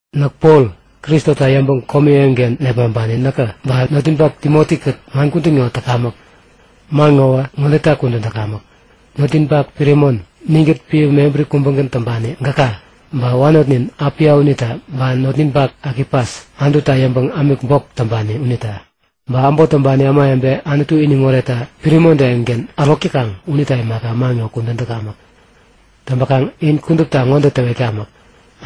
Näk Pol Kristota yäŋpäŋ komi eŋiken nepmaŋpani näkä, ba notninpak Timoti-kät man kudän ŋo täkamäk. Man ŋowä ŋodeta kudän täkamäk; Notninpak Piremon, ninkät piä mebäri kubägän täŋpani gäka, ba wanotnin Apia unita, ba notninpak Akipas, Anututa yäŋpäŋ ämik bok täŋpani unita. Ba äbot täŋpani ämawebe Anutu iniŋ oretta Piremontä eŋiken ärok täkaŋ unita imaka man ŋo kudän täkamäk. Täŋpäkaŋ in kudupta ŋode täwetkamäk;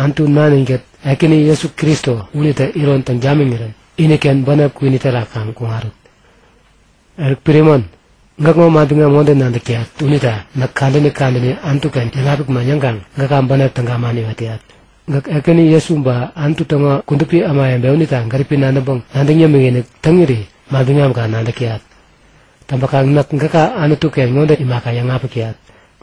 Anutu Nanin-kät Ekäni Jesu Kristo unitä iron täŋ tamiŋirän iniken bänep kwini terak kaŋ kuŋarut. Eruk, Piremon, gäkŋo manbiŋam ŋode nadäk täyat unita näk kadäni kadäni Anutu-ken yäŋapik man yäŋkaŋ gäka bänep täga man iwet täyat. Gäk Ekäni Jesu ba Anutu täŋo kudupi ämawebe unita gäripi nadäŋpäŋ nadäŋ yämikinik täŋiri manbiŋamka nadäk täyat. Täŋpäkaŋ näk gäka Anutu-ken ŋode imaka yäŋapik täyat;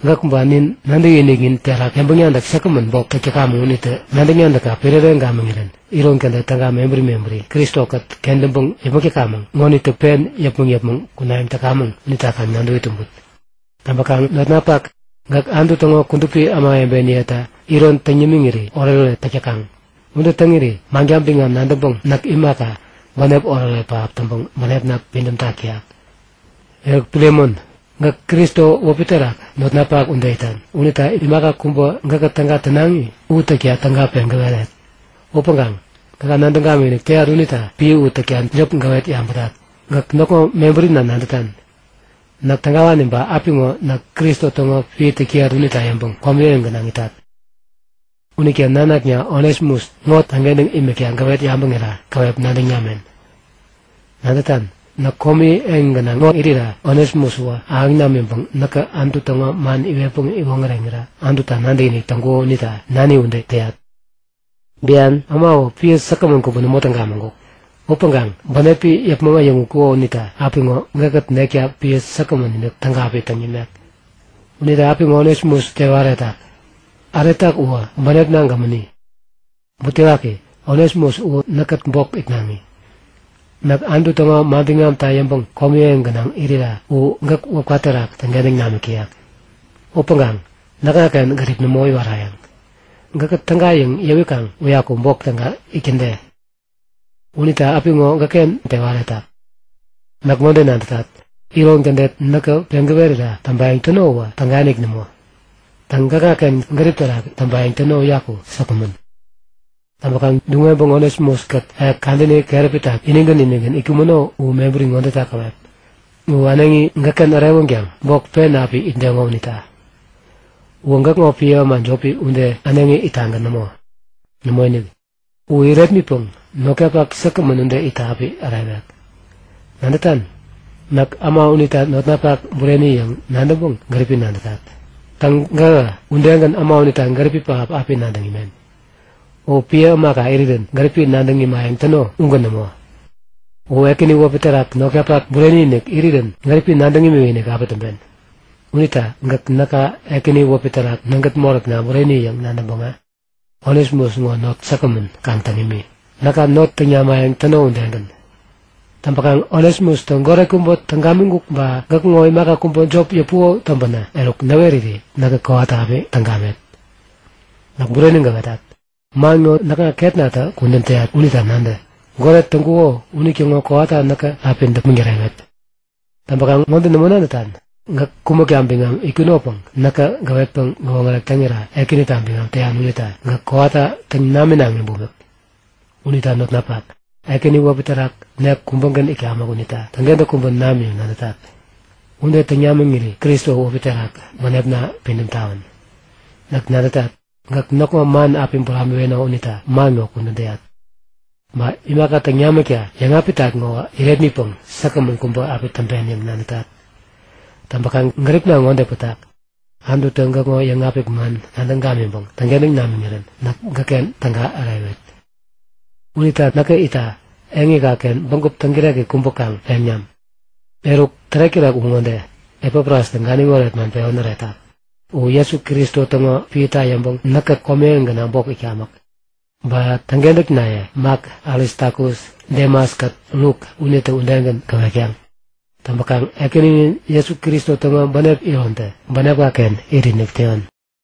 Gäk ba nin nadäkiniknin terak yäŋpäŋ-nadäk säkgämän bok täk täkamäŋ unitä nadäk-nadäkka piräreŋ gamiŋirän iron kädet täga mebäri mebäri Kristo-kät kentäŋpäŋ yäpmäk täkamäŋ ŋonitä pen yäpmäŋ yäpmäŋ kunayäŋ täkamäŋ unita kaŋ nadäwi tumbut. Täŋpäkaŋ notnapak, gäk Anutu täŋo kudupi ämawebeniyeta iron täŋ yämiŋiri oretoret täk täkaŋ. Ude täŋiri manka biŋam nadäŋpäŋ näk imaka, bänep oretoret pähap täŋpäŋ bänepna pidämtak täyak. Eruk Piremon, gäk Kristo wäpi terak notnapak ude itan unita imaka kubä gäkä täga tänaŋi u täkta täga peŋ gäweret. Upäŋkaŋ gäka nadäŋ gamikinik täyat unita piä u täkta jop gäwet yabätat. Gäk näkŋo mebärina nadätan; Näk tägawani, ba apiŋo näk Kristo täŋo piä täk täyat unita yäŋpäŋ komi eŋi gänaŋ itat. Unita nanakna Onesimus ŋo täŋkentäŋ imikta gäwet yabäŋira käwep nadäŋ namen. Nadätan? Näk komi eŋi ŋo gänaŋ irira Onesimus uwä ahäŋ namänpäŋ näkä Anutu täŋo man iwetpäŋ iwoŋäreŋira Anututa nadäkinik täŋkuko unita nani ude täyat. Bian äma uwä piä säkgämän kubä nämo täŋ gamiŋkuk. Upäŋkaŋ bänepi yäpmäŋ äyäŋutkuko unita apiŋo gäkkät nekta piä säkgämän-inik täga api täŋ nimek. Unita apiŋo Onesimus tewa äretak. Äretak uwä bänepna gämäni. Butewaki, Onesimus u näkkät bok itnaŋi. Näk Anutu täŋo manbiŋamta yäŋpäŋ komi eŋi gänaŋ irira u gäk wäpka terak täŋkentäŋ namik täyek. Upäŋkaŋ näkŋaken gärip nämo iwarayäŋ. Gäkä täga yäŋ yäwikaŋ uyaku bok täga itkäde. Unita apiŋo gäkken tewa äretak. Näk ŋode nadätat; Iron kädet näkä peŋ gäwerira täŋpayäŋ täno uwä tägainik nämo. Täŋ, gäkŋaken gärip terak täŋpayäŋ täno uyaku säkgämän. Täŋpäkaŋ duŋ-weŋpäŋ Onesimus-kät ek kadäni keräpita inigän inigän itkumäno u mebäri ŋodeta käwep; U äneŋi gäkken ärewänkaŋ bok pen api itdeŋo unita. Uwä gäkŋo piä äma jopi ude äneŋi ittagän nämo. Nämoinik. U irepmitpäŋ notkapak säkgämän ude itta api ärewek. Nadätan, näk äma unita notnapak bureni yäŋ nadäŋpäŋ gäripi nadätat. Täŋ, gähä udegän äma unita gäripi pähap api nadäŋ imen. U piä ämaka irirän gäripi nadäŋ imayäŋ täno ugän nämo. U Ekäni wäpi terak notkapak bureni-inik irirän gäripi nadäŋ imikinik api täŋpen. Unita gäk näka Ekäni wäpi terak nägät moräkna bureni yäŋ nadäŋpäŋä, Onesimus ŋo not säkgämän kaŋ täŋ imi, näka not täŋ namayäŋ täno udegän. Täŋpäkaŋ Onesimustä goret kubä täŋ gamiŋkuk ba gäkŋo imaka kubä jop yäpuko täŋpänä eruk näweriri näkä kowata api täŋ gamet. Näk bureni gäwetat. Man ŋo näkŋa ketnatä kudän täyat unita nadä; Goret täŋkuko unitäŋo kowata näkä api däpmäŋ tärewet. Täŋpäkaŋ ŋode nämo nadätan? Gäk kumäkta biŋam itkunopäŋ näkä gäwetpäŋ gäwoŋärek täŋira Ekänita biŋam täyan unita gäk kowata täŋ naminaŋi bumik. Unita notnapak, Ekäni wäpi terak nek kubägän itkamäk unita täŋkentäk kubä nam yäŋ nadätat. Ude täŋ namiŋiri Kristo wäpi terak bänepna pidäm tawän! Näk nadätat, gäk näkŋo man api buramiweno unita man ŋo kudän täyat. Ba imaka täŋ namikta yäŋapitat ŋo irepmitpäŋ säkgämän kubä api täŋpen yäŋ nadätat. Täŋpäkaŋ gäripna ŋode pätak; Anututä gäkŋo yäŋapik man nadäŋ gamiŋpäŋ täŋkentäŋ namiŋirän näk gäkken täga ärewet. Unita näkä itta, eŋika-ken bägup täŋkireki kubä kaŋ peŋ nam. Eruk, tärek-tärek u ŋode; Epafrastä ganiŋ oret man pewän äretak. U Jesu Kristo täŋo piäta yäŋpäŋ näkkät komi eŋi gänaŋ bok itkamäk. Ba täŋkentäknaye Mak, Aristakus, Demas-kät Luk unitä udegän gäwetkaŋ. Täŋpäkaŋ Ekäninin Jesu Kristo täŋo bänep irontä bänepka-ken itinik täyon.